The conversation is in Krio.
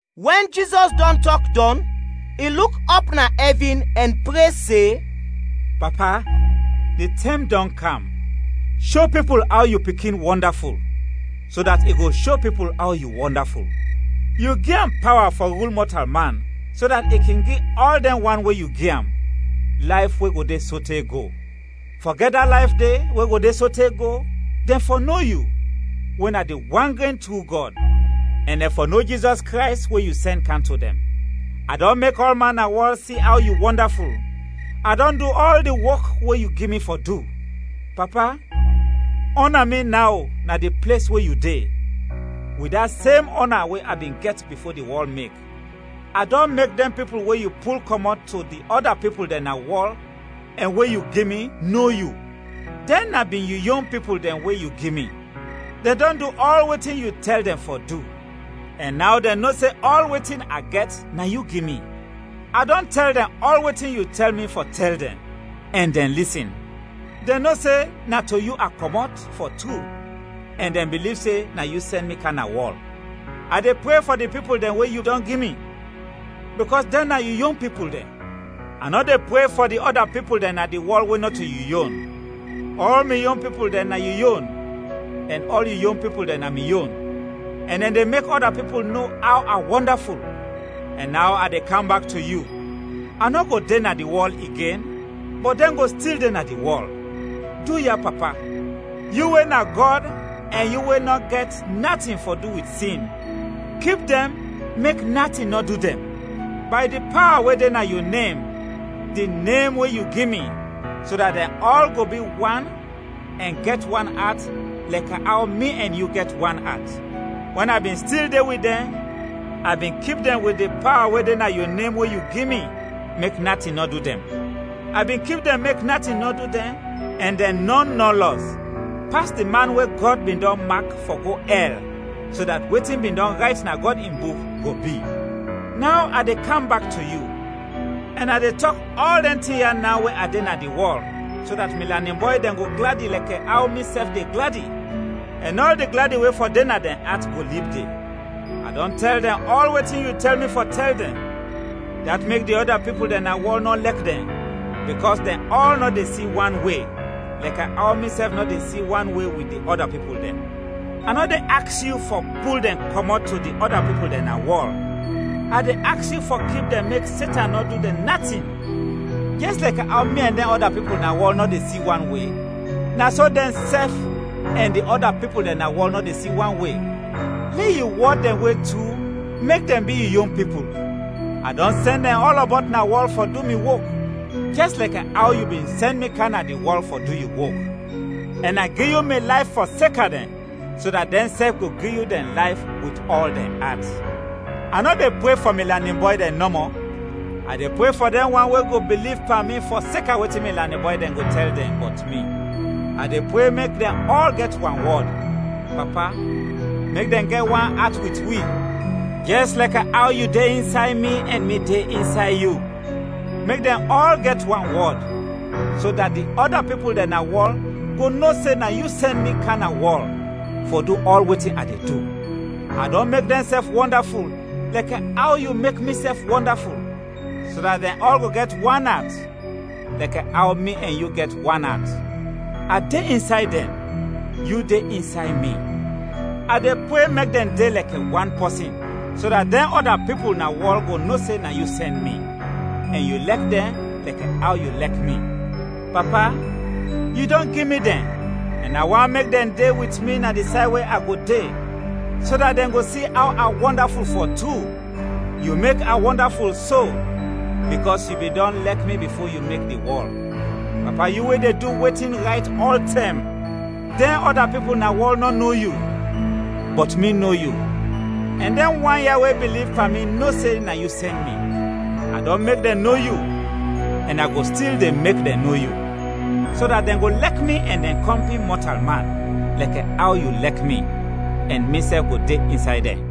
Wɛn Jizɔs dɔn tɔk dɔn, i luk ɔp na ɛvin ɛn pre se, “Papa, di tɛm dɔn kam; sho pipul aw yu Pikin wɔndaful, so dat i go sho pipul aw yu wɔndaful. Yu gi am pawa fɔ rul mɔtalman, so dat i kin gi ɔl dɛn wan we yu gi am, layf we go de sote go. Fɔ gɛt da layf de, we go de sote go, dɛn fɔ no yu, we na di wan gren tru Gɔd, ɛn dɛn fɔ no Jizɔs Krays, we yu sɛn kam to dɛn. A dɔn mek ɔlman na wɔl si aw yu wɔndaful, a dɔn du ɔl di wok we yu gi mi fɔ du. Papa, ɔna mi naw na di ples we yu de, wit da sem ɔna we a bin gɛt bifo di wɔl mek! “A dɔn mek dɛn pipul we yu pul kɔmɔt to di ɔda pipul dɛn na wɔl ɛn we yu gi mi, no yu. Dɛn na bin yu yon pipul dɛn we yu gi mi. Dɛn dɔn du ɔl wetin yu tɛl dɛn fɔ du. Ɛn naw dɛn no se ɔl wetin a gɛt na yu gi mi. A dɔn tɛl dɛn ɔl wetin yu tɛl mi fɔ tɛl dɛn, ɛn dɛn lisin. Dɛn no se na to yu a kɔmɔt, fɔ tru, ɛn dɛn biliv se na yu sɛn mi kam na wɔl. “A de pre fɔ di pipul dɛn we yu dɔn gi mi, bikɔs dɛn na yu yon pipul dɛn. A nɔ de pre fɔ di ɔda pipul dɛn na di wɔl we nɔto yu yon. Ɔl mi yon pipul dɛn na yu yon, ɛn ɔl yu yon pipul dɛn na mi yon; ɛn dɛn de mek ɔda pipul no aw a wɔndaful. Ɛn naw a de kam bak to yu; a nɔ go de na di wɔl igen, bɔt dɛn go stil de na di wɔl. Duya, Papa, yu we na Gɔd ɛn yu we nɔ gɛt natin fɔ du wit sin, kip dɛn mek natin nɔ du dɛn, bay di pawa we de na yu nem, di nem we yu gi mi, so dat dɛn ɔl go bi wan ɛn gɛt wan at lɛkɛ aw mi ɛn yu gɛt wan at. Wɛn a bin stil de wit dɛn, a bin kip dɛn wit di pawa we de na yu nem we yu gi mi mek natin nɔ du dɛn. A bin kip dɛn mek natin nɔ du dɛn ɛn dɛn nɔn nɔ lɔs, pas di man we Gɔd bin dɔn mak fɔ go ɛl so dat wetin bin dɔn rayt na Gɔd in Buk go bi. Naw a de kam bak to yu, ɛn a de tɔk ɔl dɛn tin ya naw we a de na di wɔl, so dat mi lanin bɔy dɛn go gladi lɛkɛ aw misɛf de gladi, ɛn ɔl di gladi we fɔ de na dɛn at go lib de. A dɔn tɛl dɛn ɔl wetin yu tɛl mi fɔ tɛl dɛn, dat mek di ɔda pipul dɛn na wɔl nɔ lɛk dɛn, bikɔs dɛn ɔl nɔ de si wan we, lɛkɛ aw misɛf nɔ de si wan we wit di ɔda pipul dɛn. A nɔ de aks yu fɔ pul dɛn kɔmɔt to di ɔda pipul dɛn na wɔl, a de aks yu fɔ kip dɛn mek Setan nɔ du dɛn natin. Jɛs lɛkɛ aw mi ɛn dɛn ɔda pipul na wɔl nɔ de si wan we, na so dɛnsɛf ɛn di ɔda pipul dɛn na wɔl nɔ de si wan we. Lɛ yu wɔd dɛn, we na tru mek dɛn bi yu yon pipul. A dɔn sɛn dɛn ɔlɔbɔt na wɔl fɔ du mi wok, jɛs lɛkɛ aw yu bin sɛn mi kam na di wɔl fɔ du yu wok. Ɛn a gi yu mi layf fɔseka dɛn so dat dɛnsɛf go gi yu dɛn layf wit ɔl dɛn at. “A nɔ de pre fɔ mi lanin bɔy dɛn nɔmɔ, a de pre fɔ dɛn wan we go biliv pan mi fɔseka wetin mi lanin bɔy dɛn go tɛl dɛn bɔt mi. A de pre mek dɛn ɔl gɛt wanwɔd. Papa! Mek dɛn gɛt wan at wit wi, jɛs lɛkɛ aw yu de insay mi ɛn mi de insay yu. Mek dɛn ɔl gɛt wanwɔd, so dat di ɔda pipul dɛn na wɔl go no se na yu sɛn mi kam na wɔl fɔ du ɔl wetin a de du. A dɔn mek dɛnsɛf wɔndaful lɛkɛ aw yu mek misɛf wɔndaful, so dat dɛn ɔl go gɛt wan at lɛkɛ aw mi ɛn yu gɛt wan at. A de insay dɛn, yu de insay mi; a de pre mek dɛn de lɛkɛ wan pɔsin, so dat dɛn ɔda pipul na wɔl go no se na yu sɛn mi, ɛn yu lɛk dɛn lɛkɛ aw yu lɛk mi. “Papa! Yu dɔn gi mi dɛn, ɛn a want mek dɛn de wit mi na di say we a go de, so dat dɛn go si aw a wɔndaful fɔ tru. Yu mek a wɔndaful so, bikɔs yu bin dɔn lɛk mi bifo yu mek di wɔl. Papa, yu we de du wetin rayt ɔltɛm, dɛn ɔda pipul na wɔl nɔ no yu, bɔt mi no yu, ɛn dɛn wan ya we biliv pan mi no se na yu sɛn mi. A dɔn mek dɛn no yu, ɛn a go stil de mek dɛn no yu, so dat dɛn go lɛk mi ɛn dɛn kɔmpin mɔtalman, lɛkɛ aw yu lɛk mi, ɛn misɛf go de insay dɛn.”